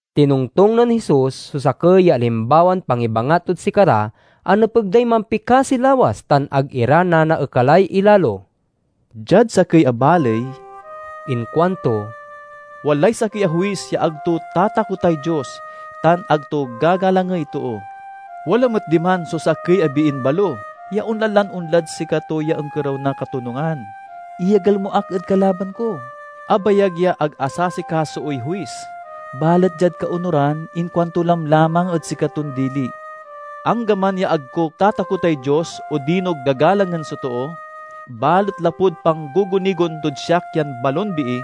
Tinongtong nen Jesus so sakey ya alimbawan pangibangat tod sikara a nepeg day mampikasi lawas tan ag ira nanaekalay ilalo. "Diad sakey a baley," inkuanto, "walay sakey a huis ya ag to tatakotay Dios tan ag to gagalangey too. Wala met diman so sakey a biin balo ya onla lan onlad sikato ya onkerew na katonungan: 'Iyagel mo ak ed kalaban ko!' Abayag ya ag asasikasoey huis, balet diad kaonuran inkuanto lamlamang ed sikaton dili, 'Anggaman ya ag ko tatakotay Dios odino gagalangen so too, balet lapud panggugunigon tod siak yan balon bii,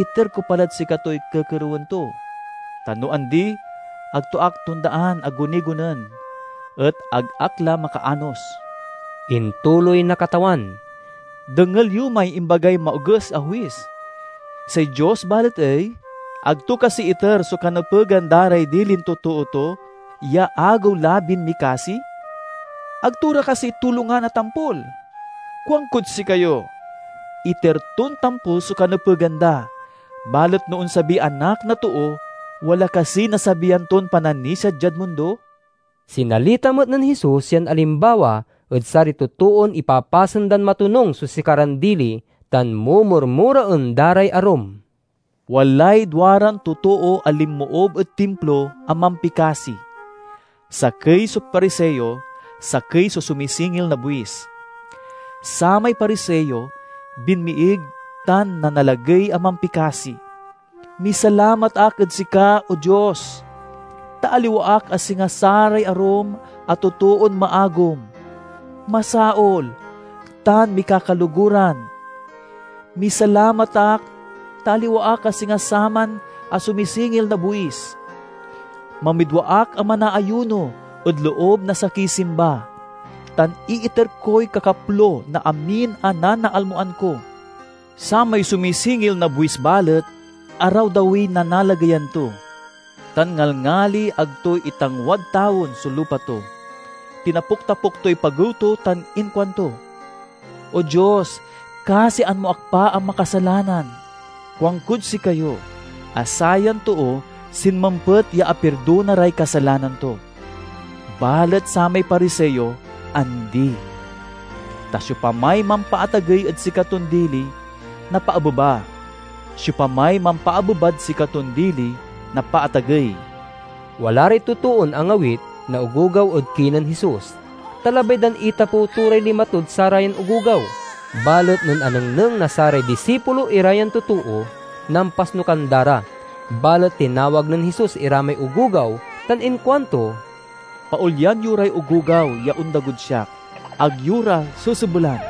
iter ko pa lad sikatoy kekerewen to. Ta no andi, ag to ak tondaan a gunigonen et ag ak la makaanos!'" Intuloy na Katawan, "Dengel yo may imbagay maoges a huis. Say Dios balet ey? Ag to kasi iter so kanepegan da ray dilin totoo to ya agewlabin mikasi? Ag to ra kasi tulongan a tampol? Kuankod sikayo: iter ton tampol so kanepegan da. Balet no onsabiy Anak na Too, wala kasiy nasabian ton pananisia diad mundo?" Sinalita met nen Jesus yan alimbawa ed saray totoon ipapasen dan matonung so sikaran dili tan mumurmuraen da ray arum. "Walay duaran totoo a linmoob ed Timplo a mampikasi. Sakey so Pariseo, sakey so sumisingil na buis. Samay Pariseo binmiig tan nanalagey a mampikasi, 'Misalamat ak ed sika, O Dios, ta aliwa ak a singa saray arum a totoon maagum, masaol, tan mikakaloguran. Misalamat ak, ta aliwa ak a singa saman a sumisingil na buis. Mamidwa ak a manaayuno ed loob na sakey simba, tan iiter koy kakaplo na amin a nanaalmoan ko!' Samay sumisingil na buis balet, arawdawiy nanalageyan to, tan ngalngali ag to itangwad tawen so lupa to. Tinapuktapuk toy pagew to tan inkuanto, 'O Dios, kasian mo ak pa a makasalanan!' Kuankod sikayo a sayan too sinmempet ya apirdona ray kasalanan to; balet samay Pariseo, andi. Ta siopamay mampaatagey ed sikaton dili, napaabeba; siopamay mampaabebad sikaton dili, napaatagey." Wala ray totoon angawit na ogogaw ed kinen Jesus, ta labay dan itapew to ray lima tod sarayan ogogaw. Balet nen anengneng na saray disipulo ira yan totoo, nampasnukan da ra. Balet tinawag nen Jesus ira may ogogaw tan inkuanto, "Paolyan yo ray ogogaw ya ondagod siak. Ag yo ra sesebelan,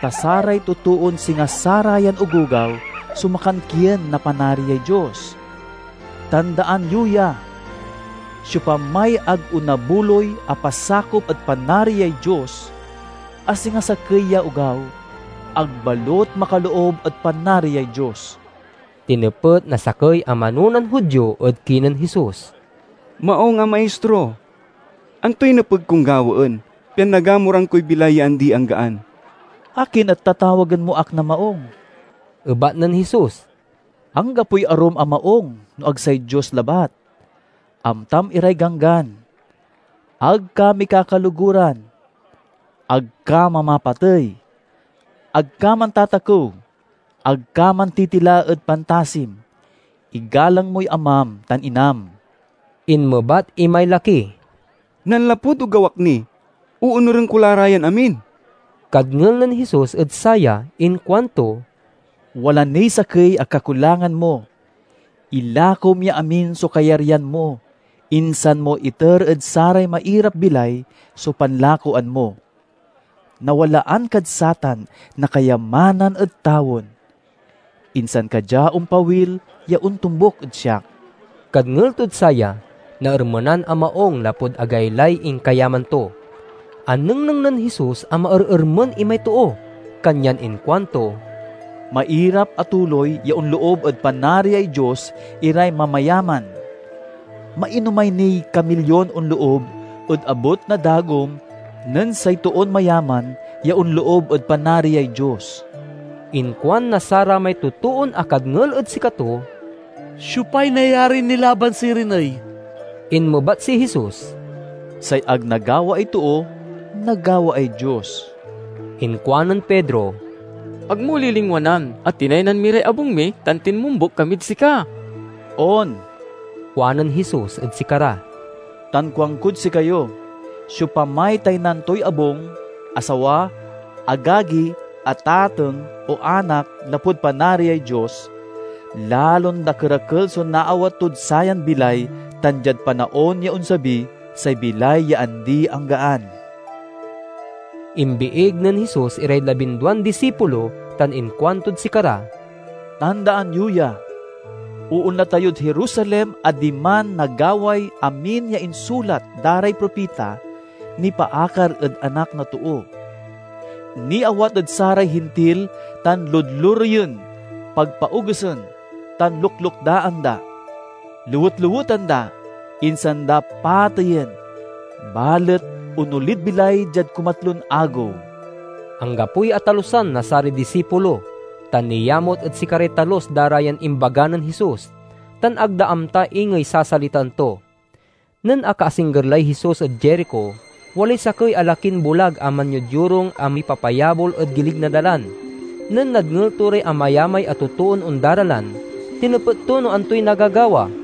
ta saray totoon singa sarayan ogogaw so makankien na Panariay Dios. Tandaan yo ya! Siopamay ag onabuloy a pasakop ed Panariay Dios a singa sakey ya ogaw, ag balut makaloob ed Panariay Dios." Tinepet na sakey a manonan Judio ed kinen Jesus, "Maung a Maistro, antoy nepeg kon gawaen pian nagamuran koy bilay ya andi-anggaan?" "Akin et tatawagen mo ak na maung?" ebat nen Jesus. "Anggapoy arum a maung no ag say Dios labat. Amtam iray ganggan: 'Ag ka mikakaloguran; ag ka mamapatey; ag ka mantatakew; ag ka mantitila ed pantasim; igalang moy amam tan inam!'" Inmebat imay laki, "Nanlapud ogaw ak ni, oonuren ko la ra yan amin." Kadngel nen Jesus ed saya inkuanto, "Wala niy sakey a kakulangan mo. Ilakom ya amin so kayaryan mo, insan mo iter ed saray mairap-bilay so panlakoan mo. Nawalaan kad satan na kayamanan ed tawen. Insan ka dia ompawil ya ontombuk ed siak." Kadngel tod saya, naermenan a maung lapud agaylay inkayaman to. Anengneng nen Jesus a maerermen imay too, kanyan inkuanto, "Mairap a tuloy ya onloob ed Panariay Dios iray mamayaman! Mainomay niy kamilyon onloob ed abut na dagom nen say toon mayaman ya onloob ed Panariay Dios." Inkuan na saramay totoon akadngel ed sikato, "Siopay nayarin nilaban sirin ey?" Inmebat si Jesus, "Say ag nagawaay too, nagawaay Dios." Inkuanen Pedro, "Ag mo lilingwanan a tinaynan mi ray abung mi tan tinmombuk kamid sika." "On," kuanen Jesus ed sikara, "tan kuankod sikayo: siopamay taynan toy abung, asawa, agagi, atateng, o anak lapud Panariay Dios, lalon dakerakel so naawat tod sayan bilay tan, diad panaon ya onsabi, say bilay ya andi-anggaan." Imbiig nen Jesus iray labinduan disipulo tan inkuantod sikara, "Tandaan yo ya! Oonla tayod Jerusalem a diman nagaway amin ya insulat da ray propita nipaakar ed Anak na Too. Niawat ed saray Hintil tan ludlureyen, pagpaogesen, tan luklukdaan da. Lewet-leweten da, insan da pateyen, balet onolid bilay diad kumatlon agew." Anggapoy atalusan na saray disipulo, ta niamut ed sikaray talus da ra yan imbaga nen Jesus, tan ag da amta ingey sasalitaen to. Nen akaasingger lay Jesus ed Jerico, walay sakey a lakin bulag a manyodyorung a mipapayabol ed gilig na dalan. Nen nadngel to ray amayamay a totoon ondaralan, tinepet to no antoy nagagawa.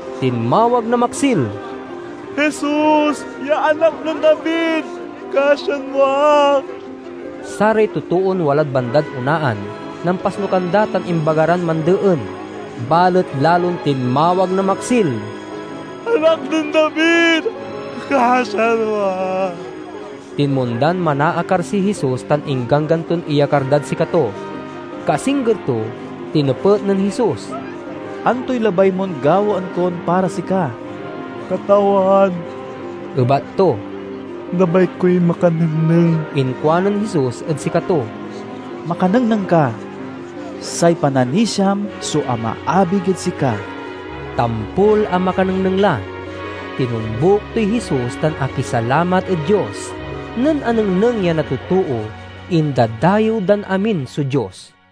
Tinmawag na maksil, "Jesus ya Anak nen David, kasian mo ak!" Saray totoon walad bandad onaan nampasnukan da tan imbaga ran mandeen, balet lalon tinmawag na maksil, "Anak nen David! Kasian mo ak!" Tinmondan manaakar si Jesus tan ingganggan ton iyakar dad sikato. Kaasingger to, tinepet nen Jesus, "Antoy labay mon gawaen kon para sika?" "Katawan," ebat to, "labay koy makanengneng." Inkuanen Jesus ed sikato, "Makanengneng ka! Say pananisiam so amaabig ed sika." Tampol a makanengneng la. Tinombuk toy Jesus tan akisalamat ed Dios. Nen anengneng ya na totoo, indadayew dan amin so Dios.